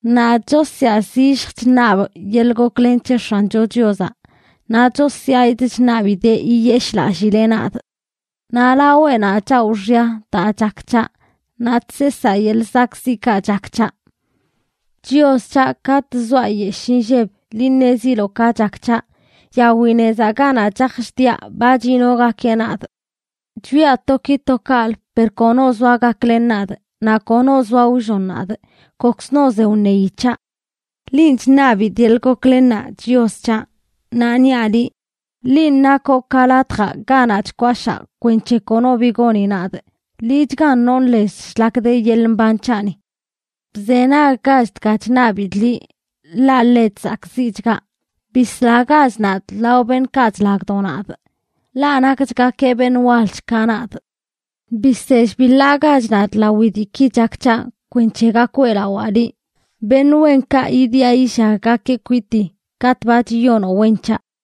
Nadꞌ chosyaa zillj chṉabꞌ yeḻꞌ goklen c̱he X̱ancho Chiozaꞌ, naꞌ chosyaꞌidꞌ chṉabidee yiyeshꞌlallileꞌ nadꞌ. Naꞌ laweꞌnaꞌ chawꞌ xya daa chak c̱haꞌ, naꞌ chseesaa yeḻꞌ zakꞌziꞌkaꞌ chak c̱haꞌ. Chios c̱haꞌ, katꞌ zoaꞌ nyeshꞌ inlleb, liꞌ ṉeziloꞌ ka chak c̱haꞌ. Yawi nezaꞌ ganaꞌ chaj chdiaꞌ, ba chiꞌnogakeꞌ nadꞌ. Chwiaꞌ to ki to kaꞌlə per kono zoa gaklen nadꞌ, naꞌ kono zoa wllon nadꞌ. Kokzno ze wṉeyi c̱haꞌ. Linꞌ chṉabidꞌ yeḻꞌ goklennaꞌ, Chios c̱haꞌ, naꞌ niaꞌ liꞌ: “Linꞌ nakoꞌ ka latjaꞌ ganaꞌ chkwashaa kwenc̱he kono bi goni nadꞌ; liꞌchgan nonꞌ lez shlak de yeḻꞌ mban c̱haꞌni.” Bzenaggach dga chṉabidꞌ liꞌ, ḻaꞌ ḻe chzakꞌziꞌchgaꞌ. Bislagach nadꞌ lao beṉꞌkaꞌ chlagdo nadꞌ, ḻaꞌ nakchgakeꞌ beṉꞌ walch ka nadꞌ. Bisell biḻaagach nadꞌ lawi diiki chak c̱haꞌ kwenc̱he gak weꞌlawaa liꞌ. Beṉꞌ wenkaꞌ yidiꞌa yillaggakeꞌ kwitii katꞌ ba chiyonoꞌ wen c̱haꞌ.